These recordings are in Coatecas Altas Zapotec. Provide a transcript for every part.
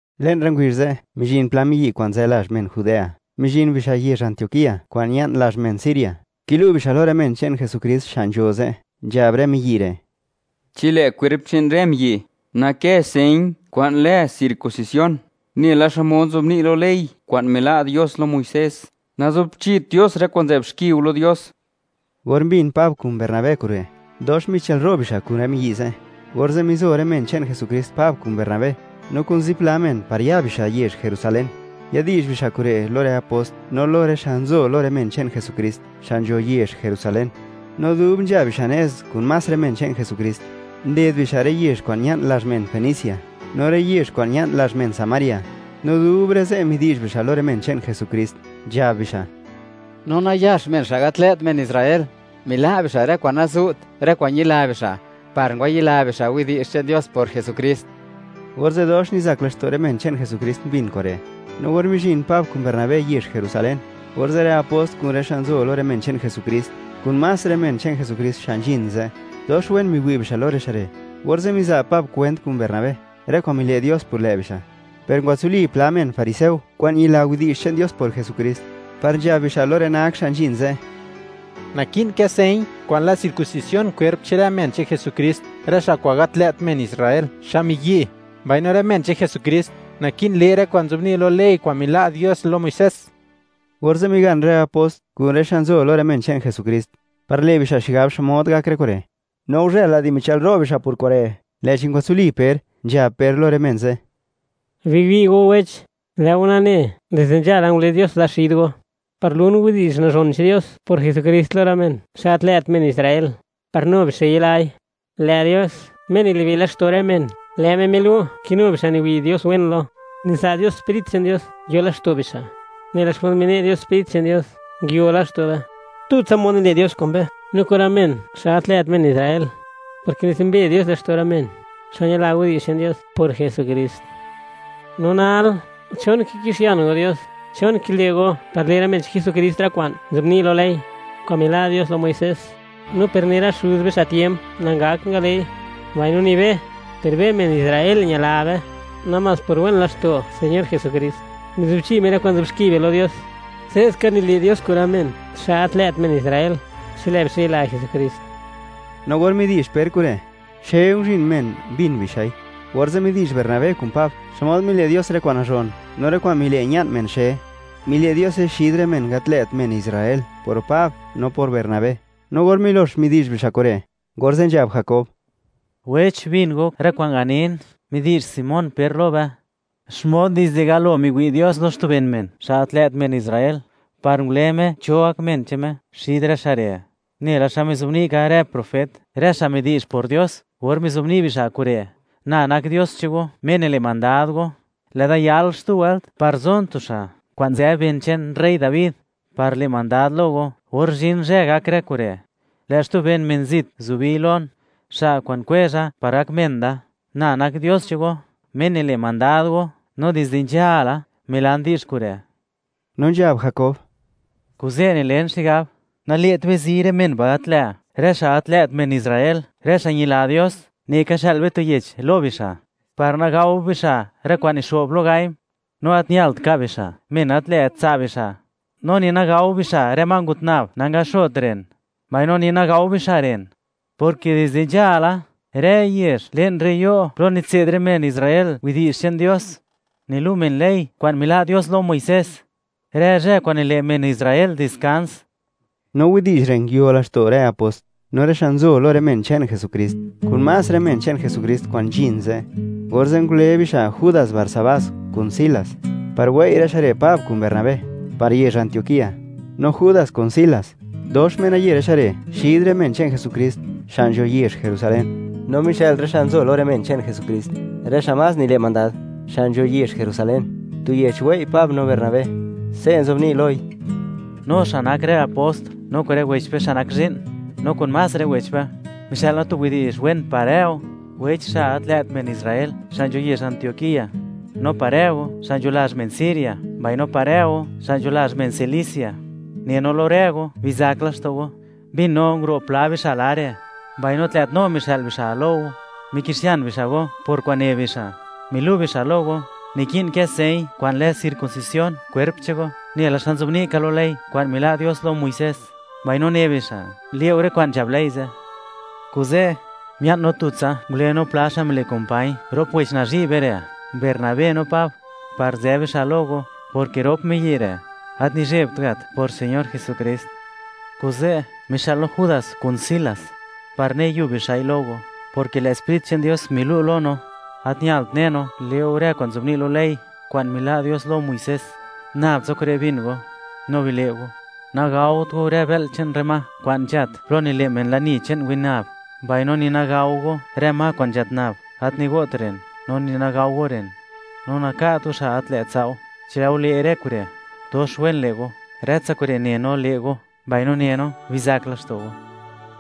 Le'n rë ngubizh ze', mizhin pla miyi' kwa'n nzë lazh men Judea, mizhin bixa' yezh Antioquía kwa'n ña'n lazh men Siria, kilu' bixa' lo rë men che'n Jesukrist xa' nzho ze', nzhab rë miyi' re': ―Chi lë' kwerp che'n rë miyi' nakë señ kwa'n lë circuncisión nela xmod nzobni' lo ley kwa'n mila' Dios lo Muisés, nazubchit Dios rë kwa'n nzë'b xki go lo Dios. Or mbin Pab kun Bernabé kure', dox michëlro' bixa' kun rë miyi' ze'. Orze' mizo rë men che'n Jesukrist Pab kun Bernabé, no kun zipla men, par ya bixa' yezh Jerusalén, yadi'zh bixa' kure' lo rë apost no lo rë xa' nzo lo rë men che'n Jesukrist, xa' nzho yezh Jerusalén. No dub nzha bixa' nez kun más rë men che'n Jesukrist, nded bixa' rë yezh kwa'n ña'n lazh men Fenicia no rë yezh kwa'n ña'n lazh men Samaria, no dub rë ze' midi'zh bixa' lo rë men che'n Jesukrist, nzhab bixa': ―Nu nayax men gat lë't men Israel, mila' bixa' rë kwa'n nazu't, rë kwa'n ñila bixa', par ngwayila bixa' widi'zh che'n Dios por Jesukrist. Orze' dox nizak laxto' rë men che'n Jesukrist mbin kure'. No or mizhin Pab kun Bernabé yezh Jerusalén, orze' rë apost kun rë xa' nzo lo rë men che'n Jesukrist, kun más rë men che'n Jesukrist xa' nzhin ze'; dox wen miwi' bixa' lo rë xa' re', orze' miza' Pab kwent kun Bernabé, rë kwa'n mile' Dios por lë' bixa'. Per ngwatsuli pla men fariseo kwa'n ñila widi'zh che'n Dios por Jesukrist, par nzhab bixa' lo rë nak xa' nzhin ze': ―Naki'n kë señ kwa'n lë circuncisión kwerp che'n rë men che'n Jesukrist, rë xa' kwa'n gat lë't men Israel, xa' miyi', mbaino rë men che'n Jesukrist naki'n le' rë kwa'n nzobni' lo ley kwa'n mila' Dios lo Muisés. Orze' migan rë apost kun rë xa' nzo lo rë men che'n Jesukrist, par le' bixa' xigab xmod gak rë kure'. No guzhël-la di michëlro' bixa' por kure', lë'chi ngwatsuli Per, nzhab Per lo rë men ze': ―Biwi' go wech, lë' go nane, dizde nzhala ngule Dios da xid go, par lun widi'zh nazhon che'n Dios por Jesukrist lo rë men xa' gat lë't men Israel, par nu bixa' yilai. Lë' Dios, Me nilibe' laxto' rë men, lë' Me milu' ke nu bixa' niwi' Dios wen lo, niza' Dios Sprit che'n Dios yo laxto' bixa', nela xmod mine' Dios Sprit che'n Dios nguio laxto' be. Tutsa mod nile' Dios kun be, no kun rë men xa' gat lë't men Israel, porke nitsumbe Dios laxto' rë men, xa' ñila widi'zh che'n Dios por Jesukrist. No nal, ¿chon kikixian go Dios? ¿Chon kile' go, par le' rë men che'n Jesukrist rë kwa'n nzobni' ley, kwa'n mila' Dios lo Muisés, no per ni rë xuz be xa' tiemp nangakt ngale'i; mbaino ni be? Per be, men Israel, ñila be, namás por wen laxto' Señor Jesukrist, mizubchi Me rë kwa'n nzë'b xki be lo Dios. Se'ska nile' Dios kun rë men, xa' gat lë't men Israel, chi lë' bixa' yila Jesukrist. No or midi'zh Per kure', xe nguzhin men, mbin bixa'i. Orze' midi'zh Bernabé kun Pab xmod mile' Dios rë kwa'n nazhon no rë kwa'n mile' ña'n xe men. Mile' Diose xid rë men gat lë't men Israel por Pab no por Bernabé. No or milox midi'zh bixa' kure', orze' nzhab Jakob: ―Wech, bin go rë kwa'n ganin. Midi'zh Simón Per lo be, xmod dizde galo miwi' Dios lo xtu ben xa' gat lë't men Israel, par ngule Me cho gak men che'n Me xid rë xa' re', nela xa mizobni' ka rë profet, rë xa' midi'zh por Dios, or mizobni' bixa' kure': Na nak Dios che'n go, Me nile' mandad go, lë'da yal xtu wëlt, par zon tu xa' kwa'n nzë ben che'n rey Dabi, par le' mandad lo go. Or zhin zhë, gak rë kure', lë' xtu ben men zit zubi Lon, xa' kwa'n kwezha par gak men Da. Na nak Dios che'n go, Me nile' mandad go, no dizde nzhala, milan di'zh kure'. No nzhab Jakob: ―Kuze', nilen xigab: Nale't be zi rë men ba' gat lë', rë xa' gat lë't men Israel, rë xa' ñila Dios. Neka xë'l be tu yech lo bixa', par nagao bixa' rë kwa'n nixo'b lo gaim. No gat ñalt ka' bixa' men gat lë't tsa' bixa', no ni nagao bixa' rë ma ngut nab, nangaxot ren, mbaino ni nagao bixa' ren; porke dizde nzhala, rë yezh, le'n rë yo' plo nitse'd rë men Israel widi'zh che'n Dios, nilu' men ley kwa'n mila' Dios lo Muisés, rë zhë kwa'n nile' men Israel diskans. No widi'zh re', nguio laxto' rë apost, no rë xa' nzo lo rë men che'n Jesukrist, kun más rë men che'n Jesukrist kwa'n nzhin ze'. Orze' ngule bixa' Judas Barsabás, kun Silas, par wei' rë xa' re', Pab kun Bernabé, par yezh Antioquía. No Judas kun Silas, dox menaye rë xa' re', xid rë men che'n Jesukrist, xa' nzho yezh Jerusalén. No mixë'l rë xa' nzo lo rë men che'n Jesukrist, rë xa' nzho yezh Jerusalén, tu yech wei' Pab no Bernabé; se' nzobni' loi: “No xa' nak rë apost, no kun rë wech be xa' nak zhi'n, no kun más rë wech be; mixë'l no tu widi'zh wen par rë go, wech, xa' gat lë't men Israel, xa' nzho yezh Antioquía; no par rë go, xa' nzho lazh men Siria, mbaino par rë go, xa' nzho lazh men Cilicia. Ne no lo rë go bizak laxto' go. Mbin no, nguro' pla bixa' lare', mbaino gat lë't no mixë'l bixa' lo go, mikixian bixa' go por kwa'n ne bixa'. Milu' bixa' lo go, niki'n kë señ kwa'n lë circuncisión kwerp che'n go, nela xa nzobni' ka lo ley kwa'n mila' Dios lo Muisés, mbaino ne bixa', le' go rë kwa'n nzhab ley ze'. Kuze', mia'n no tutsa, ngule no pla xa' mile' kumpañ rop wech nazhi' be re', Bernabé no Pab, par nzë bixa' lo go, porke rop miyi' re', gat nizhebt gat por Señor Jesukrist. Kuze', mixë'l no Judas kun Silas, par ne yub bixa'i lo go, porke lë' Sprit che'n Dios milu' lo no, gat ñalt ne no, le' go rë kwa'n nzobni' lo ley kwa'n mila' Dios lo Muisés. Nabtsa kure' bin go no bile' go: Nagaot go rë bë'l che'n rë ma kwa'n nzhat plo nile' men lani che'n winab, mbaino ni nagao go rë ma kwa'n nzhat nab, gat nigo't ren; no ni nagao go ren, no naka't go xa' gat lë't tsa' go. Chi lë' go le' rë kure', dox wen le' go. Rëtsa kure' ne no le' go. Mbaino ne no, bizak laxto' go.”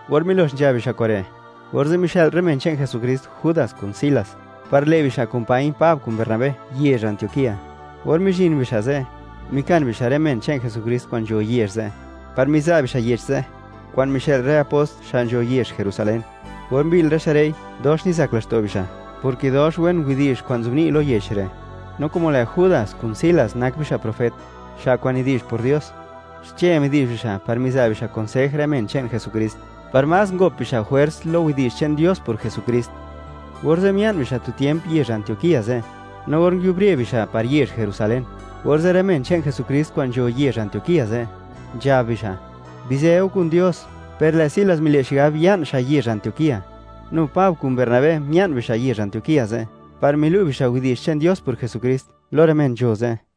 Or milox nzhab bixa' kure', orze' mixë'l rë men che'n Jesukrist Judas kun Silas, par le' bixa' kumpañ Pab kun Bernabé yezh Antioquía. Or mizhin bixa' ze', mikan bixa' rë men che'n Jesukrist kwa'n nzho yezh ze', par miza' bixa' yech ze', kwa'n mixë'l rë apost xa' nzho yezh Jerusalén. Or mbi'l rë xa' re'i, dox nizak laxto' bixa', porke dox wen widi'zh kwa'n nzobni' lo yech re'. No como lë' Judas kun Silas nak bixa' profet, xa' kwa'n nidi'zh por Dios, xche midi'zh bixa' par miza' bixa' konsej rë men che'n Jesukrist, par más ngop bixa' jwers lo widi'zh che'n Dios por Jesukrist. Orze' mia'n bixa' tu tiemp yezh Antioquía ze'. No or nguiubre bixa' par yezh Jerusalén, orze' rë men che'n Jesukrist kwa'n nzho yezh Antioquía ze', nzhab bixa': “Bizë go kun Dios.” Per lë' Silas mile' xigab ya'n xa' yezh Antioquía. Nu Pab kun Bernabé mia'n bixa' yezh Antioquía ze', par milu' bixa' widi'zh che'n Dios por Jesukrist lo rë men nzho ze'.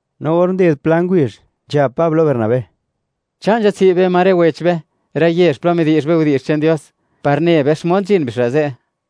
No or nded pla ngubizh, nzhab Pab lo Bernabé: ―Cha' nzhatsi' be ma rë wech be, rë yezh plo midi'zh be widi'zh che'n Dios, par ne be xmod nzhin bixa' ze'.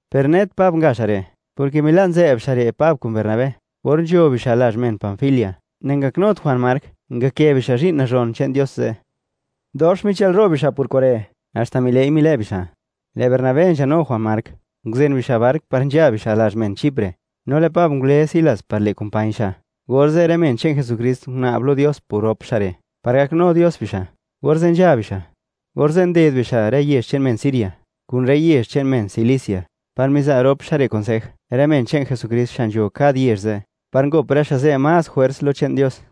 per net Pab nga xa' re', porke mila' nzë'b xa' re' Pab kun Bernabé or nzho bixa' lazh men Panfilia, nangaknut Juan Mark, ngakë bixa' zhi'n nazhon che'n Dios ze'. Dox michëlro' bixa' por kure', haxta mile'i milë' bixa'. Lë' Bernabé nzhanu Juan Mark, nguzen bixa' bark par nzha bixa' lazh men Chipre, no lë' Pab ngule Silas, par le' kumpañ xa', orze' rë men che'n Jesukrist guna'b lo Dios por rop xa' re', par gaknu Dios bixa', orze' nzha bixa'. Orze' nded bixa' rë yezh che'n men Siria, kun rë yezh che'n men Cilicia, par miza' rop xa' re' konsej rë men che'n Jesukrist xa' nzho kad yezh ze', par ngop rë xa' ze' más jwers lo che'n Dios.